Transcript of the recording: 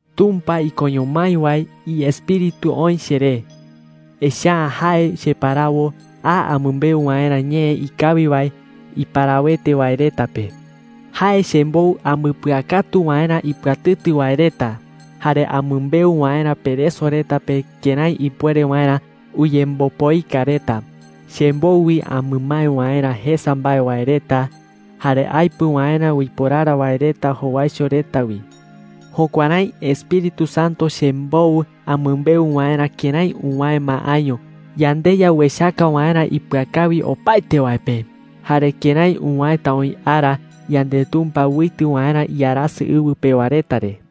Tumpa ikoño mái wae iEspíritu oï cheré, echa’ä jae cheparawo a amɨmbeu waerä ñee ikawi wae iparawete wae reta pe. Jae chembou ambɨpɨakatu waerä ipɨatɨtɨ wae reta, jare amɨmbeu waerä pereso reta pe kërái ipuere waerä uyembopoika reta. Chembou wi amɨmae waerä jesa mbae wae reta, jare aepɨ waerä uiporara wae reta jowaicho reta wi. Jukuärái Espíritu Santo chembou amɨmbeu waerä kërái uwäe ma año yandeYa uechaka waerä ipɨakawi opaete wae pe, jare kërái uwäeta oï ara yandeTumpa uitɨ waerä iarasɨ ɨwɨ pewa reta re.